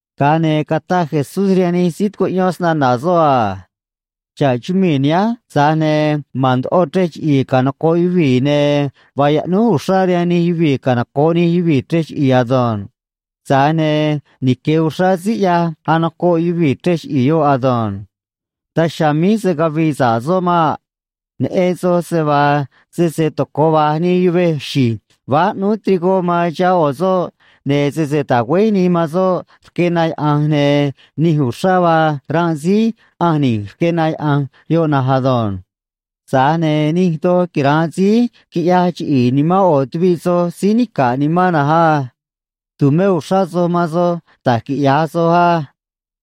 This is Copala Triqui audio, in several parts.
Ga̱a ne̱ cataj Jesús rihaan nij síí tucuꞌyón snana̱ soꞌ a: ―Xa̱ꞌ chumii̱ nihánj, tza̱j ne̱ ma̱n ndoꞌo chrej chiꞌi̱i̱ canoco̱ꞌ yuvii̱, ne̱ vaa yaꞌnúj uxrá rihaan nij yuvii̱ canoco̱ꞌ nij yuvii̱ chrej chiꞌi̱i̱ ado̱nj. Tza̱j ne̱ nique̱ uxrá síí ꞌyaj anocoꞌ yuvii̱ chrej chiꞌi̱i̱ yoꞌ ado̱nj. Daj chiha̱a̱ míj se̱ cavii sa̱ꞌ soꞌ maꞌ. Neꞌen soj se vaa sese tocoꞌ vaj nii yuvej xi̱j váj ꞌnúú trigó man chihá ꞌo̱ soꞌ, ne̱ sese tagüéj nii man soꞌ rque na yaꞌa̱nj, ne̱ nij uxrá vaa ranꞌ síí ꞌanj ni̱j rque na yaꞌa̱nj yoꞌ na̱nj ado̱nj. Tza̱j ne̱ nij doj quira̱nꞌ síí quiꞌyaj chiꞌi̱i̱ nimán ꞌo̱ tuviꞌ soj síí nica̱ꞌ nimán na̱nj á. ’Tu̱mé uxrá soj man soj da̱j quiꞌya̱j soj á.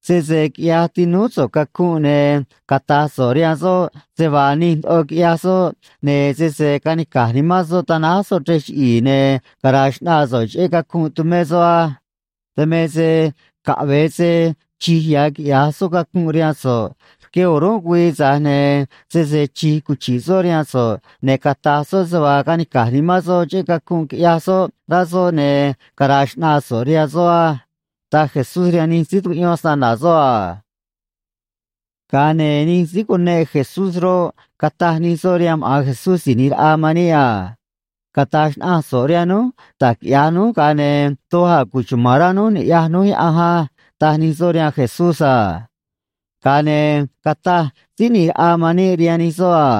Sese quiꞌyaj tinúú so̱ꞌ cacunꞌ, ne̱ cata̱j so̱ꞌ rihaan soꞌ se vaa nij ndoꞌo quiꞌyaj soꞌ, ne̱ sese ca̱nica̱j nimán soꞌ ta̱náj soꞌ chrej chiꞌi̱i̱, ne̱ cara̱a̱ xꞌnaa so̱ꞌ cheꞌé cacunꞌ tumé soꞌ á. Dan me se caꞌve̱e se chi̱j ya̱ quiꞌya̱j soꞌ cacunꞌ rihaan so̱ꞌ rque o̱rúnꞌ güii, tza̱j ne̱ sese chi̱j cuchi̱ꞌ soꞌ rihaan so̱ꞌ ne̱ cata̱j soꞌ se vaa canica̱j nimán soꞌ cheꞌé cacunꞌ quiꞌyaj soꞌ rá soꞌ, ne̱ cara̱a̱ xꞌnaa so̱ꞌ rihaan soꞌ á ―taj Jesús rihaan nij síí tucuꞌyón snana̱ soꞌ a. Ga̱a ne̱ nij síí cuneꞌ Jesús roꞌ, cataj nij soꞌ rihaan maꞌa̱n Jesús Si̱j ꞌNi̱j Raꞌa man níꞌ a: ―Cata̱j xnaꞌanj so̱ꞌ rihaan núj da̱j quiꞌya̱j núj, ga̱a ne̱ doj a̱ cuchuma̱n rá núj ni̱ꞌyaj núj Yaꞌanj á ―taj nij soꞌ rihaan Jesús a. Ga̱a ne̱ cataj Síí ꞌNi̱j Raꞌa man níꞌ rihaan nij soꞌ a: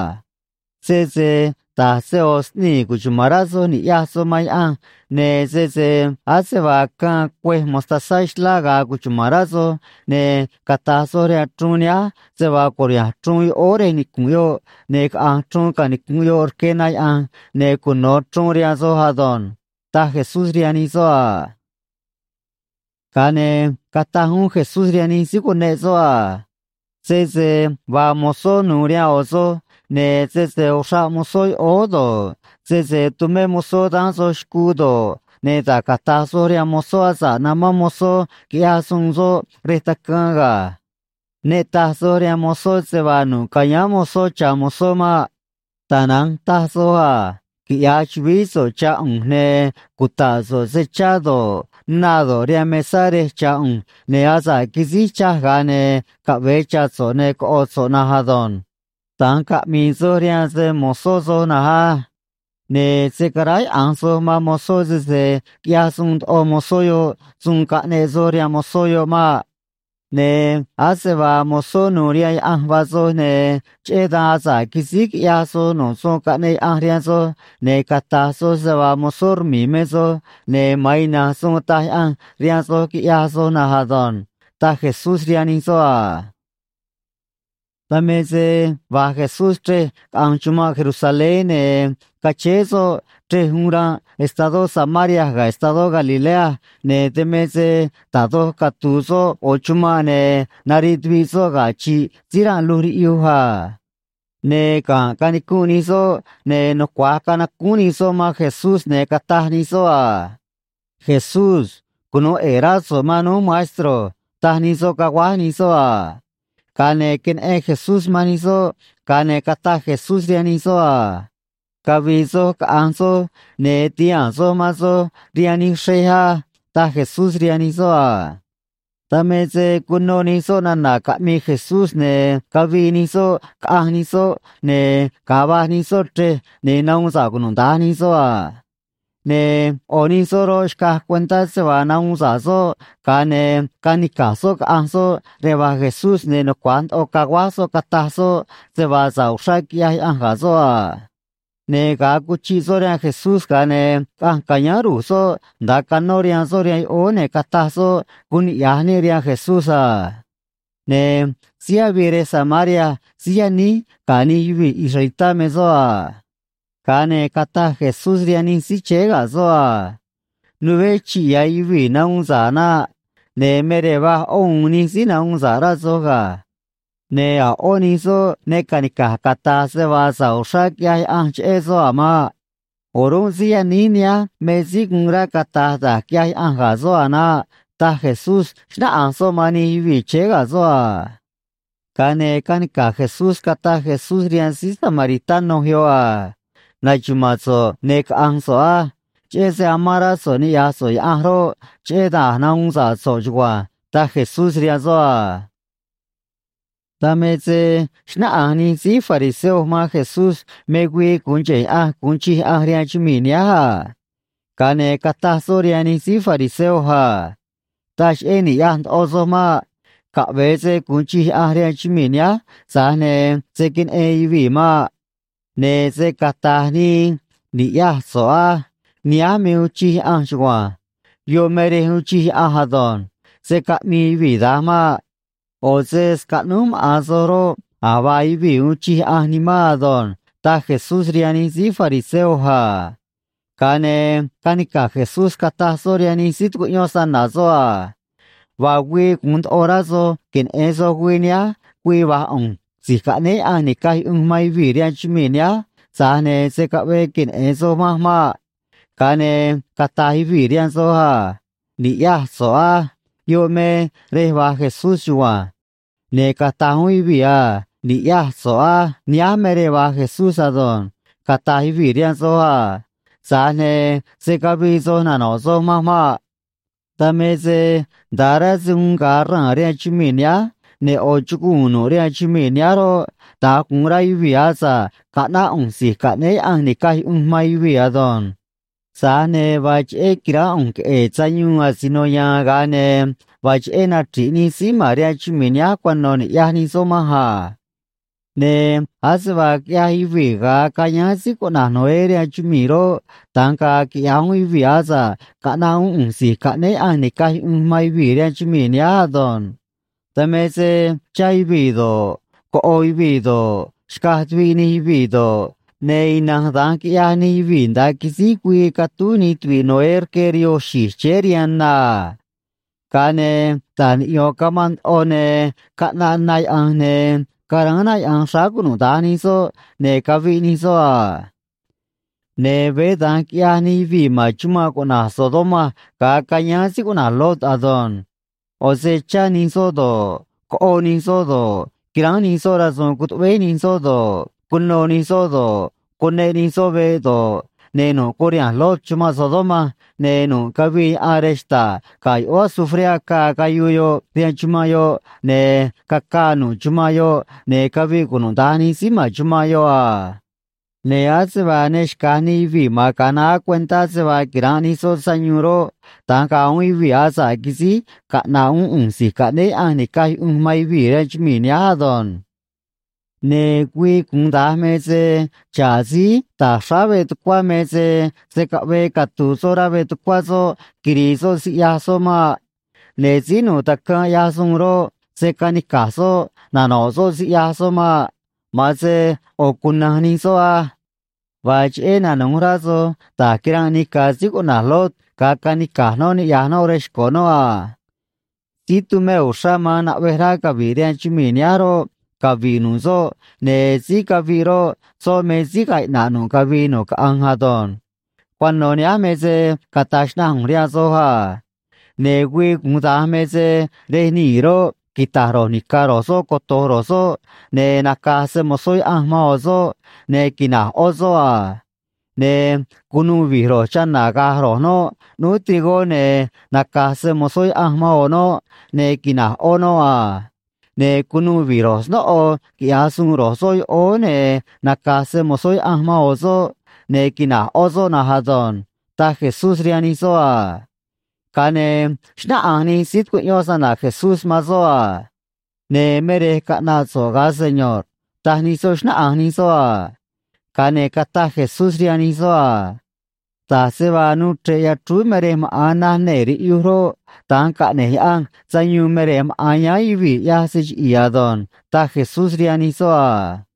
―Sese da̱j se ꞌo̱ sꞌnii̱ cuchuma̱n rá soj ni̱ꞌyaj soj man Yaꞌanj, ne̱ sese ase vaa caân cuêj mostazá xlá ga̱a̱ cuchuma̱n rá soj, ne̱ cata̱j soj rihaan chruun nihánj se vaa cu̱riha̱nj chruun yoꞌóó rej nicu̱nꞌ yoꞌ ne̱ caꞌa̱nj chruun canicu̱nꞌ yoꞌ rque na yaꞌa̱nj, ne̱ cuno̱ chruun rihaan soj ado̱nj ―taj Jesús rihaan nij soꞌ a. Ga̱a ne̱ cataj uún Jesús rihaan nij síí cuneꞌ soꞌ a: ―Sese vaa mozó nu̱u̱ rihaan ꞌo̱ soj, ne̱ sese uxraꞌ mozó yoꞌóó do̱ꞌ, sese tumé mozó daán soj xcuu do̱ꞌ, ne̱ da̱j cata̱j soj rihaan mozó asa̱ꞌ namán mozó quiꞌya̱j suun soꞌ rej tacaan ga̱. Ne taj soj rihaan mozó se vaa nu̱ꞌ ca̱yáán mozó cha̱ mozó maꞌ. Tana̱nj ta̱j soj a: “Quiꞌya̱j chu̱vií so̱ꞌ cha̱ ꞌu̱nj, ne̱ cuta̱ꞌ so̱ꞌ se chá do̱ꞌ, na do̱ꞌ, rihaan mesá rej cha̱ ꞌu̱nj, ne̱ asa̱ꞌ quisíj chaj ga̱a ne̱ caꞌve̱e cha̱ so̱ꞌ ne̱ coꞌo̱ so̱ꞌ na ado̱nj.” Da̱nj caꞌmi̱i̱ soj rihaan se‑mo̱zó soj na̱nj á. Ne̱ se̱ caráyaꞌa̱nj soj man mozó sese quiꞌyaj suun ndoꞌo mozó yoꞌ suun caꞌneꞌ soj rihaan mozó yoꞌ maꞌ. Ne̱ ase vaa mozó nu̱u̱ rihaan Yaꞌanj vaa soj, ne̱ cheꞌé dan asa̱ꞌ quisíj quiꞌyaj soj nu̱ꞌ suun caꞌneꞌ Yaꞌanj rihaan soj, ne̱ cata̱j soj se vaa mozó rmi̱i̱ me soj, ne̱ ma̱an ina̱nj suun taj Yaꞌanj rihaan soj quiꞌyaj soj na̱nj ado̱nj ―taj Jesús rihaan nij soꞌ a. Dan me se va̱j Jesús chrej caꞌanj chumanꞌ Jerusalén, ne̱ cachéé soꞌ chrej uun ra̱nꞌ estadó Samaria ga̱ estadó Galilea, ne̱ dan me se da̱j doj catu̱u̱ soꞌ ꞌo̱ chumanꞌ, ne̱ nariꞌ tuviꞌ soꞌ ga̱ chi̱ꞌ síí ranꞌ luj riꞌyuj a. Ne̱ ga̱nꞌ canicunꞌ nij soꞌ, ne̱ nucua̱j canacúún nij soꞌ man Jesús, ne̱ cataj nij soꞌ a: ―Jesús. Cunu̱u ꞌe̱e̱ rá so̱ꞌ man núj, maestro ―taj nij soꞌ, caguáj nij soꞌ a. Ga̱a ne̱ queneꞌen Jesús man nij soꞌ, ga̱a ne̱ cataj Jesús rihaan nij soꞌ a: ―Cavi̱i̱ soj caꞌa̱nj soj, ne̱ ti̱haa̱n soj man soj rihaan nij xrej á ―taj Jesús rihaan nij soꞌ a. Dan me se cuno nij soꞌ nana̱ caꞌmii Jesús, ne̱ cavii nij soꞌ, caꞌanj nij soꞌ, ne̱ ga̱a va̱j nij soꞌ chrej, ne̱ nahuun sa̱ꞌ cunuda̱nj nij soꞌ a. Ne̱ ꞌo̱ nij soꞌ roꞌ, xcaj cuentá se vaa nahuun sa̱ꞌ soꞌ, ga̱a ne̱ canica̱j soꞌ caꞌanj soꞌ rej va̱j Jesús, ne̱ nucua̱j ndoꞌo caguáj soꞌ cataj soꞌ se vaa sa̱ꞌ uxrá quiꞌyaj Yaꞌanj ga̱ soꞌ a. Ne̱ ga̱a cuchiꞌ soꞌ rihaan Jesús, ga̱a ne̱ caꞌanj ca̱yáán ru̱j soꞌ nda̱a canó rihaan soꞌ rihaan yoꞌóó, ne̱ cataj soꞌ guun niꞌya̱j níꞌ rihaan Jesús a. Ne̱ síí avii rej Samaria síí yaníj ga̱ nij yuvii̱ israelitá me soꞌ a. Ga̱a ne̱ cataj Jesús rihaan nij síí chéé ga̱ soꞌ a: ―Nuveé chi̱ꞌ ya̱ yuvii̱ nahuun sa̱ꞌ naꞌ. Ne̱ me rej va̱j ꞌó u̱u̱n nij síí nahuun sa̱ꞌ, rá soj ga̱. Ne̱ a̱ ꞌó nij soꞌ ne ca̱nica̱j cata̱j se vaa sa̱ꞌ uxrá quiꞌyaj Yaꞌanj cheꞌé soꞌ a̱ maꞌ. O̱rúnꞌ síí yaníj nihánj me síí guun rá cata̱j da̱j quiꞌyaj Yaꞌanj ga̱ soꞌ a̱ naꞌ ―taj Jesús, xnáꞌanj soꞌ man nij yuvii̱ chéé ga̱ soꞌ a. Ga̱a ne̱ canica̱j Jesús cataj Jesús rihaan síí samaritano yoꞌ a: ―Na̱xuma̱a̱n so̱ꞌ, ne̱ caꞌa̱nj so̱ꞌ á. Cheꞌé se amán rá so̱ꞌ niꞌya̱j so̱ꞌ Yaꞌanj roꞌ, cheꞌé dan a̱j nahuun sa̱ꞌ so̱ꞌ chugua̱nj ―taj Jesús rihaan soꞌ a. Dan me se xnáꞌanj nij síí fariseo man Jesús me güii gu̱un cheꞌe̱ Yaꞌanj gu̱un chij Yaꞌanj rihaan chumii̱ nihánj a. Ga̱a ne̱ cataj soꞌ rihaan nij síí fariseo a: ―Taj cheꞌé ni̱ꞌyaj ndoꞌo soj maꞌ. Caꞌve̱e se gu̱un chij Yaꞌanj rihaan chumii̱ nihánj, tza̱j ne̱ se̱ queneꞌen yuvii̱ maꞌ. Ne̱ se̱ cataj nii: “Ni̱ꞌyaj so̱ꞌ á. Nihánj me uun chij Yaꞌanj chugua̱nj. Yoꞌ me rej uun chij Yaꞌanj ado̱nj.” Se̱ caꞌmii yuvii̱ da̱nj maꞌ. ꞌO̱ se scaꞌnúj maꞌa̱n soj roꞌ, a̱j vaa yuvii̱ uun chij Yaꞌanj nimán ado̱nj ―taj Jesús rihaan nij síí fariseo a. Ga̱a ne̱ canica̱j Jesús cataj soꞌ rihaan nij síí tucuꞌyón snana̱ soꞌ a: ―Vaa güii gu̱un ndoꞌo rá soj queneꞌe̱n soj güii nihánj güii va̱j ꞌu̱nj Si̱j Caꞌnéé Yaꞌanj Ni̱caj Yuꞌunj man Yuvii̱ rihaan chumii̱ nihánj, tza̱j ne̱ se̱ caꞌvee queneꞌe̱n soj manj maꞌ. Ga̱a ne̱ cata̱j yuvii̱ rihaan soj a: “Ni̱ꞌyaj so̱ꞌ á. Yoꞌ me rej va̱j Jesús chugua̱nj.” Ne̱ cata̱j uún yuvii̱ a: “Ni̱ꞌyaj so̱ꞌ á. Nihánj me rej va̱j Jesús ado̱nj”, cata̱j yuvii̱ rihaan soj a. Tza̱j ne̱ se̱ cavii soj nano̱ꞌ soj manj maꞌ. Dan me se nda̱a rá se uun ga̱a raa̱n rihaan chumii̱ nihánj, ne̱ ꞌo̱ chuguu̱n nu̱ꞌ rihaan chumii̱ nihánj roꞌ, da̱nj gu̱un rá yuvii̱ asa̱ꞌ caꞌnáꞌ ꞌu̱nj Si̱j Caꞌnéé Yaꞌanj Ni̱caj Yuꞌunj man Yuvii̱ ado̱nj. Tza̱j ne̱ vaa cheꞌé qui̱ránꞌ ꞌu̱nj queꞌe̱e̱ sayuun asino ya̱a̱n, ga̱a ne̱ vaa cheꞌé nachri̱ꞌ nij síí ma̱n rihaan chumii̱ nihánj cuano̱ ni̱ꞌyaj nij soꞌ manj a. ’Ne̱ ase vaa quiꞌyaj yuvii̱ ga̱a cayáán síí cuꞌna̱j Noé rihaan chumii̱ roꞌ, da̱nj ga̱a̱ quiꞌya̱j uún yuvii̱ asa̱ꞌ caꞌna̱ꞌ uún ꞌu̱nj Si̱j Caꞌnéé Yaꞌanj Ni̱caj Yuꞌunj man Yuvii̱ rihaan chumii̱ nihánj ado̱nj. Dan me se chá yuvii̱ do̱ꞌ, coꞌo yuvii̱ do̱ꞌ, xcaj tuviꞌ nij yuvii̱ do̱ꞌ, ne̱ ina̱nj da̱nj quiꞌyaj nij yuvii̱ nda̱a quisíj güii catúj nij tuvi̱ꞌ Noé rque rihoo xi̱j chéé rihaan na a. Ga̱a ne̱ ta̱j niꞌyo̱n camanꞌ ndoꞌo, ne̱ caꞌnaꞌ na yaꞌa̱nj, ne̱ caráán na yaꞌa̱nj xráá cunuda̱nj nij soꞌ, ne̱ caviꞌ nij soꞌ a. Ne̱ veé da̱nj quiꞌyaj nij yuvii̱ ma̱n chumanꞌ cuꞌna̱j Sodoma ga̱a cayáán síí cuꞌna̱j Lot ado̱nj. ꞌO̱ se chá nij soꞌ do̱ꞌ, coꞌo nij soꞌ do̱ꞌ, quiránj nij soꞌ rasu̱u̱n cutuꞌvéj nij soꞌ do̱ꞌ, cunô nij soꞌ do̱ꞌ, cuneꞌ nij soꞌ veꞌ do̱ꞌ, ne̱ nu̱ꞌ curiha̱nj Lot chumanꞌ Sodoma, ne̱ nu̱ꞌ cavii yaꞌan rej xta̱ꞌ ga̱ yoꞌóó azufré acaa, cayuu yoꞌ rihaan chumanꞌ yoꞌ, ne̱ cacaa nu̱ꞌ chumanꞌ yoꞌ, ne̱ caviꞌ cunuda̱nj nij síí ma̱n chumanꞌ yoꞌ a. Ne̱ ase vaa ne xca̱j nij yuvii̱ ma̱n ga̱a naá cuentá se vaa quira̱nꞌ nij soꞌ sayuun roꞌ, da̱nj ga̱a̱ uún yuvii̱ asa̱ꞌ quisíj caꞌna̱ꞌ uún ꞌu̱nj Si̱j Caꞌnéé Yaꞌanj Ni̱caj Yuꞌunj man Yuvii̱ rihaan chumii̱ nihánj ado̱nj. ’Ne̱ güii gu̱un da̱nj me se xa̱ꞌ síí ta̱j xráá veꞌ tucuá me se se̱ caꞌvee catu̱u̱ soꞌ rá veꞌ tucuá soꞌ quiri̱i̱ soꞌ siꞌyaj soꞌ maꞌ. Ne̱ síí nu̱u̱ tacaan ꞌyaj suun roꞌ, se̱ canica̱j soꞌ nano̱ꞌ soꞌ siꞌyaj soꞌ maꞌ. Ma̱an se ꞌo̱ cuna̱nj nij soꞌ á. Vaa cheꞌé nanu̱j rá soj da̱j quiranꞌ nica̱ síí cuꞌna̱j Lot ga̱a canica̱j noꞌ niꞌya̱j noꞌ rej xco̱ noꞌ a. ’Síí tumé uxrá man naꞌvej rá cavi̱ꞌ rihaan chumii̱ nihánj roꞌ, cavi̱ꞌ nu̱ꞌ soꞌ, ne̱ síí caviꞌ roꞌ, soꞌ me síí ga̱a̱ iꞌna̱ꞌ nu̱ꞌ cavii nu̱ꞌ caꞌanj ado̱nj. ’Cuano̱ nihánj me se cata̱j xnaꞌanj ꞌu̱nj rihaan soj a. Ne̱ güii gu̱un da̱nj me se rej nii̱ roꞌ, quita̱j ro̱j ni̱ca̱ ro̱j soꞌ coto̱j ro̱j soꞌ, ne̱ naca̱j se‑mo̱zó Yaꞌanj man ꞌo̱ soꞌ, ne̱ quina̱j ꞌó soꞌ a. Ne̱ cu̱nuû vi̱j ro̱j chana̱ ga̱j ro̱j noꞌ ꞌnúú trigó, ne̱ naca̱j se‑mo̱zó Yaꞌanj man ꞌo̱ noꞌ, ne̱ quina̱j ꞌó noꞌ a. Ne̱ cu̱nuû vi̱j ro̱j snóꞌo quiꞌya̱j suun ro̱j soꞌ yoꞌóó, ne̱ naca̱j se‑mo̱zó Yaꞌanj man ꞌo̱ soꞌ, ne̱ quina̱j ꞌó soꞌ na̱nj ado̱nj ―taj Jesús rihaan nij soꞌ a. Ga̱a ne̱ xnáꞌanj nij síí tucuꞌyón snana̱ Jesús man soꞌ a: ―Ne̱ me rej caꞌna̱ꞌ so̱ꞌ, ga̱a Seño̱rꞌ ―taj nij soꞌ, xnáꞌanj nij soꞌ a. Ga̱a ne̱ cataj Jesús rihaan nij soꞌ a: ―Da̱j se vaa nuu chre̱ꞌ yachrúú me rej maꞌa̱n naj nee̱ riꞌyuj roꞌ, da̱nj caꞌne̱j Yaꞌanj sayuun me rej maꞌa̱n yáán yuvii̱ ꞌyaj se chiꞌi̱i̱ ado̱nj ―taj Jesús rihaan nij soꞌ a.